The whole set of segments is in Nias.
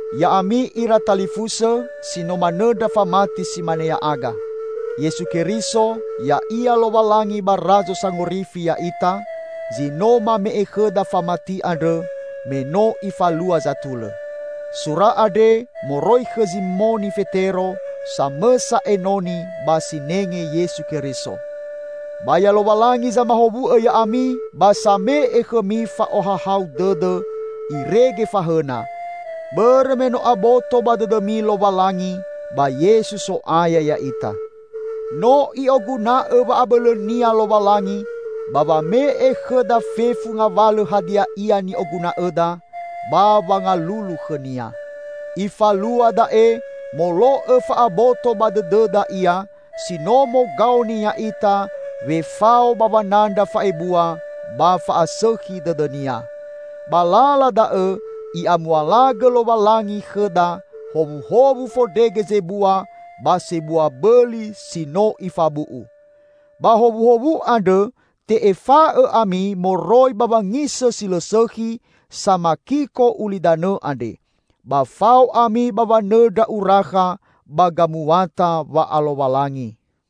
Ya'ami ira talifusõ si no manõndra famati si mane ya'aga. Yesu Keriso, Ya'ia Lowalangi ba Razo Sangorifi ya'ita, zi no mame'e khõda famati andrõ, me no Ifalua zatulõ. Sura andre moroi khõ Zimoni Fetero, samõsa enoni ba sinenge Yesu Keriso. Ba ya Lowalangi zamahowu'õ ya'ami ba same'e khõmi fa'ohahau dõdõ irege fahõna, bõrõ me no aboto ba dõdõmi Lowalangi ba Yesu So'aya ya'ita. No I'oguna'õ wa'abõlõ-Nia Lowalangi ba wame'e khõda fefu ngawalõ hadia ia ni'oguna'õda ba wangalulu khõ-Nia. Ifalua da'e molo'õ fa'aboto ba dõdõda Ia si no mogaoni ya'ita wefao ba wanandra fa'ebua ba fa'asõkhi dõdõ-Nia. Ba lala da'õ I'amualagõ Lowalangi khõda howuhowu fondrege zebua ba sebua bõli si no Ifabu'u. Ba howuhowu andrõ te'efa'õ ami moroi ba wangisõ si lõ sõkhi, samakiko ulidanõ andre. Ba fao ami ba wanõndra urakha ba gamuata wa'alowalangi.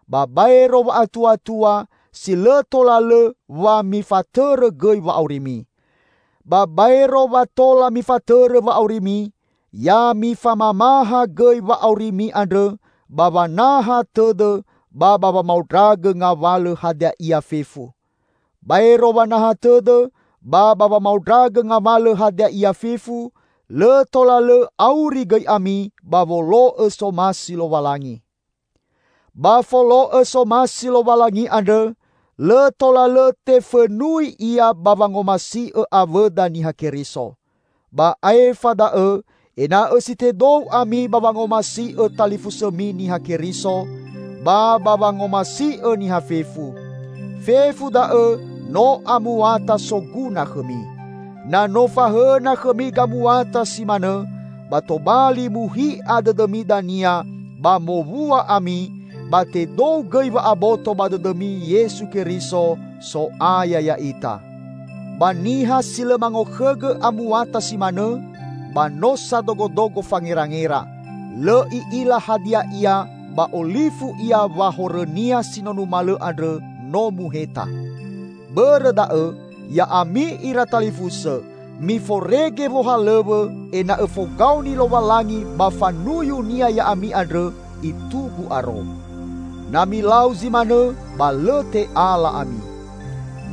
ba baero wa'atuatua, si lõ tola lõ wa mifatõrõ gõi wa'aurimi. Ba baero wa tola mifatõrõ wa'aurimi, ya mifamamaha gõi wa'aurimi andrõ ba wanaha tõdõ ba wamaondragõ ngawalõ hadia ia fefu. Baero wanaha tõdõ ba wamaondragõ ngawalõ hadia ia fefu, lõ tola lõ auri gõi ami ba wolo'õ somasi Lowalangi. Ba folo'õ somasi Lowalangi andrõ, lõ tola lõ tefõnui ia ba wangomasi'õ awõda Niha Keriso. Ba aefa da'õ, ena'õ si tedou ami ba wangomasi'õ talifusõmi Niha Keriso, ba ba wa ngomasi'õ niha fefu. Fefu da'õ no amuata soguna khõmi. Na no fahõna khõmi gamuata si manõ, ba tobali muhi'a dõdõmi dania ba mowua ami, ba tedou gõi wa'aboto ba dõdõmi Yesu Keriso, So'aya ya'ita. Ba niha si lõ mangokhõgõ amuata si manõ, ba no sadogodogo fangerangera; lõ i'ila hadia ia ba olifu ia wa horõnia si no numalõ andrõ no muheta. Bõrõ da'õ, ya'ami ira talifusõ, miforege wohalõw̃õ ena'õ fogaoni Lowalangi ba fanuyu-Nia ya'ami andrõ itugu aro. Na milau zi manõ, ba lõ te'ala ami.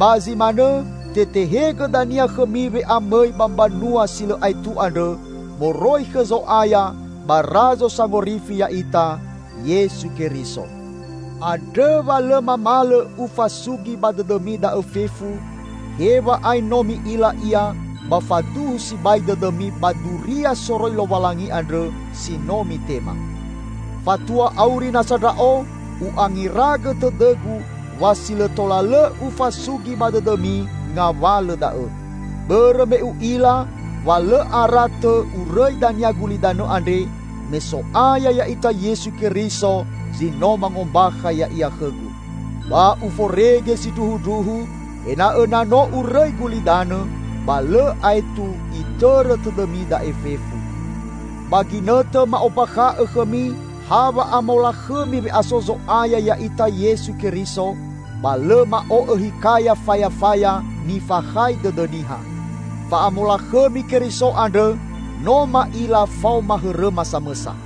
Ba zi manõ, tetehegõ dania khõmi we'amõi ba Mbanua si lõ aetu andrõ moroi khõ Zo'aya ba Razo Sangorifi ya'ita Yesu Keriso. Andrõ wa lõ mamalõ ufasugi ba dõdõmi da'õ fefu, hew̃a'ae no mi'ila ia ba faduhu sibai dõdõmi ba duria soroi Lowalangi andrõ si no mitema. Fatua auri nasa ndra'o, u'angeragõ tõdõgu wa si lõ tola lõ ufasugi ba dõdõmi ngawalõ da'õ. Bõrõ me u'ila wa lõ ara tõ urõi dania gulidanõ andre, me So'aya ya'ita Yesu Keriso zi no mangombakha Ya'ia khõgu. Ba uforege sindruhundruhu ena'õ na no urõi gulidanõ, ba lõ aetu itõrõ tõdõmi da'e fefu. Ba ginõtõ ma'ombakha'õ khõmi ha wa'amolakhõmi we'aso Zo'aya ya'ita Yesu Keriso, ba lõ ma'o'õ hikaya fayafaya nifakhai dõdõ niha. Fa'amolakhõmi Keriso andrõ no ma'ila faoma hõrõma samõsa.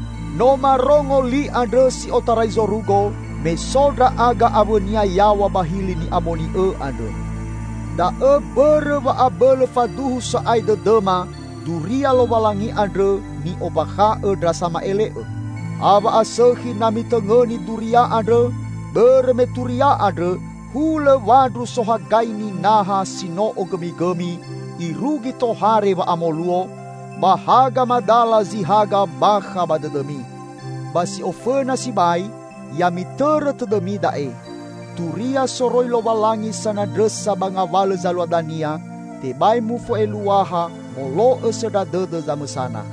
No marongo li andrõ si otarai zorugo me so ndra'aga awõ-Nia yaw̃a ba hili ni'amoni'õ andrõ. Da'õ mbõrõ wa abõlõ faduhu sa'ae dõdõma duria Lowalangi andrõ ni'ombakha'õ ndra sama'ele'õ. Ha wa'asõkhi na mitõngõni duria andrõ, bõrõ me turia andrõ, hulõ wandru sohagaini naha si no ogõmigõmi irugi tohare wa'amoluo, ba haga madala zi haga bakha ba dõdõmi. Ba si ofõna sibai, ya mitõrõ tõdõmi da'e: Turia soroi Lowalangi sanandrõsa ba ngawalõ zalua dania, tebai mufo'eluaha molo'õ sõndra dõdõ zamõsana.